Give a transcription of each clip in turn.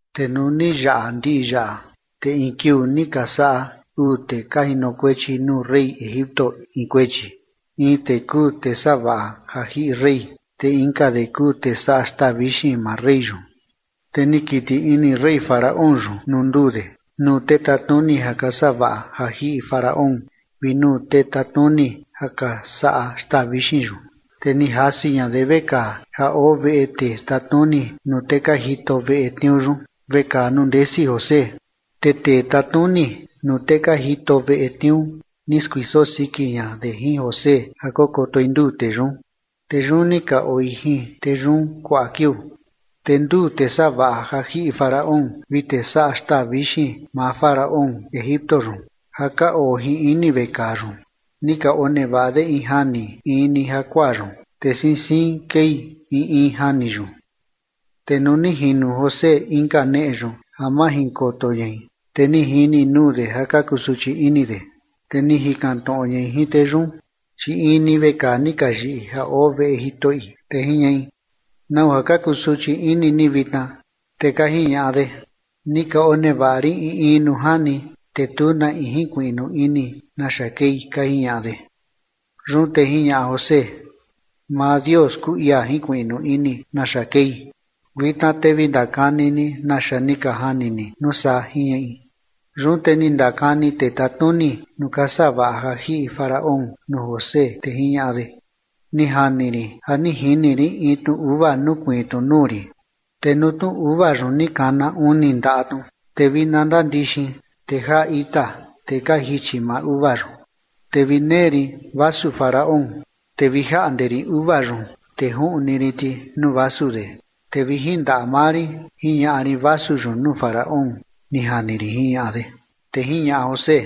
Te nuu ni yaꞌa ndiꞌi yaꞌa, te in kiuu ni ka saꞌa uu tee ka jinokuechi nuu rey Egipto in kuechi, in de kuu tee savaꞌa ja jiꞌi rey, te inka de kuu tee saꞌa xtaa vixin maa rey yun. Te ni kiti ini rey Faraón yun nuu nduu de, nuu tee tatnuni ja ka savaꞌa ja jiꞌi Faraón vi nuu tee tatnuni ja ka saꞌa xtaa vixin yun, te ni jasi ña de vekaa ja oo veꞌe tee tatnuni nuu tee ka jito veꞌe tniuu yun, vekaa nuu ndesi José. Te tee tatnuni nuu tee ka jito veꞌe tniuu ni skuiso siki ña de jin José ja kokotoi nduu tee yun. Te yun ni ka oi jin tee yun kuaꞌa kiuu. Te nduu tee savaꞌa ja jiꞌi Faraón vi tee saꞌa xtaa vixin maa Faraón Egipto yun ja ka oo jin ini vekaa yun, ni ka onevaꞌa de in jani in ni jakuaa yun, te siin siin kei in in jani yun. Te nuu ni jino José inka neꞌe yun ja majinkoto ñai, te ni jini nuu de ja ka kusuchi ini de. Te ni jikan tnoꞌo ñai jin tee yun, chi in ni vekaa ni ka yiꞌi ja oo veꞌe jitoꞌi, te jiñaꞌi: ―¿Nau ja ka kusuchi ini ni vitna? Te ka jiñaꞌa de: ―Ni ka onevaꞌa rin in in nuu jani, te tu na in jinkuiꞌnu ini naxa kei ―ka jiñaꞌa de. Yun te jiñaꞌa José: ―Maa Dios kuu ia jinkuiꞌnu ini naxa kei. Vitna te vi ndakani ni naxa ni ka jani ni nuu saa ―jiñaꞌi. Yun te ni ndakani tee tatnuni nuu ka savaꞌa ja jiꞌi Faraón nuu José, te jiñaꞌa de: ―Ni jani rin ja ni jini rin in tnu uva nukuiin tnu nuu rin, te nuu tnu uva yun ni kana uni ndaꞌa tnu, te vi na ndandixin, te jaa ita, te ka jichi maa uva yun. Te vi nee rin vasu Faraón, te vi jaꞌnde rin uva yun, te juꞌni rin ti nuu vasu de, te vi jin ndaꞌa maa rin jiñaꞌa rin vasu yun nuu Faraón, ni jani rin ―jiñaꞌa de. Te jiñaꞌa José: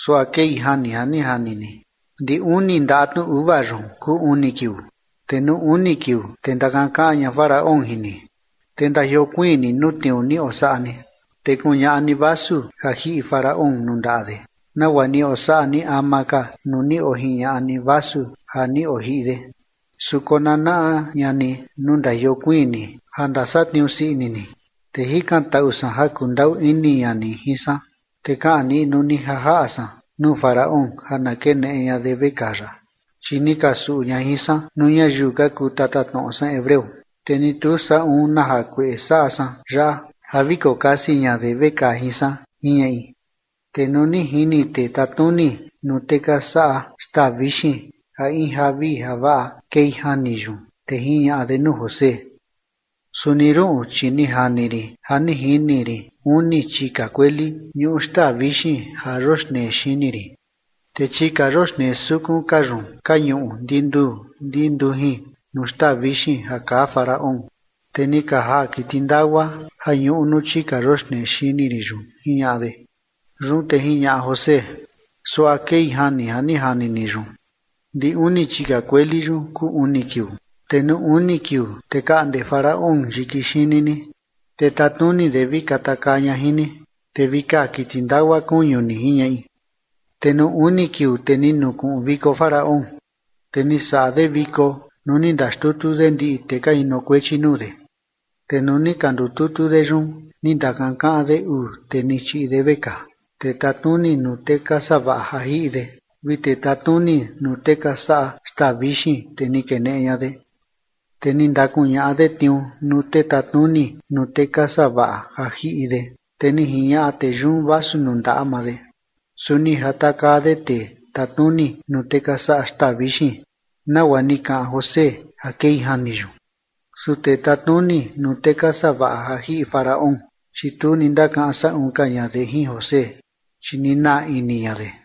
―Suaꞌa kei jani ja ni jani ni: ndi uni ndaꞌa tnu uva yun kuu uni kiuu, te nuu uni kiuu, te ndakankaꞌan ña Faraón jin ni, te ndajiokuiin ni nuu tniuu ni osaꞌa ni, te kuñaꞌa ni vasu ja jiꞌi Faraón nuu ndaꞌa de, nagua ni osaꞌa ni ama ka nuu ni ojiñaꞌa ni vasu ja ni ojiꞌi de. Su konanaꞌa ña ni nuu ndajiokuiin ni ja ndasatniuu sii ini ni, te jikantaꞌu san ja kundaꞌu ini ña ni jin san, te kaꞌan niꞌnu ni ja jaꞌa san nuu Faraón ja na keneꞌe ña de vekaa yaꞌa. Chi ni ka suꞌu ña jin san nuu ñayiu ka kuu tatatnoꞌo san hebreo, te ni tu saꞌun na jakueꞌe saꞌa san yaꞌa ja vi kokasi ña de vekaa jin san ―jiñaꞌi. Te nuu ni jini tee tatnuni nuu tee ka saꞌa xtaa vixin ja in javii javaꞌa kei jani yun, te jiñaꞌa de nuu José: ―Suni ruꞌun, chi ni jani rin ja ni jini rin uni chika kueli ñuꞌu xtaa vixin ja yoxnee xini rin. Te chika yoxnee sukun ka yun ka ñuꞌu ndinuu ndi ndujin nuu xtaa vixin ja kaa Faraón, te ni ka jaa kiti ndagua ja ñuꞌu nuu chika yoxnee xini rin yun ―jiñaꞌa de. Yun te jiñaꞌa José: ―Suaꞌa kei jani ja ni jani ni yun: ndi uni chika kueli yun kuu uni kiuu. Te nuu uni kiuu, te kaꞌnde Faraón yiki xini ni, te tatnuni de vi katakaa ña jin ni, te vi kaa kiti ndagua kuñu ni ―jiñaꞌi. Te nuu uni kiuu, te ni nukuꞌun viko Faraón, te ni saꞌa de viko nuu ni ndaxtutu de ndiꞌi tee ka jinokuechi nuu de. Te nuu ni ka ndututu de yun ni ndakankaꞌan de uu tee ni chiꞌi de vekaa, tee tatnuni nuu tee ka savaꞌa ja jiꞌi de vi tee tatnuni nuu tee ka saꞌa xtaa vixin, te ni keneꞌe ña de. Te ni ndakuñaꞌa de tniuu nuu tee tatnuni nuu tee ka savaꞌa ja jiꞌi de, te ni jiñaꞌa tee yun vasu nuu ndaꞌa maa de. Su ni jatakaa de tee tatnuni nuu tee ka saꞌa xtaa vixin, nagua ni kaꞌan José ja kei jani yun. Su tee tatnuni nuu tee ka savaꞌa ja jiꞌi Faraón, chi tu ni ndakaꞌan saꞌun ka ña de jin José, chi ni naa ini ña de.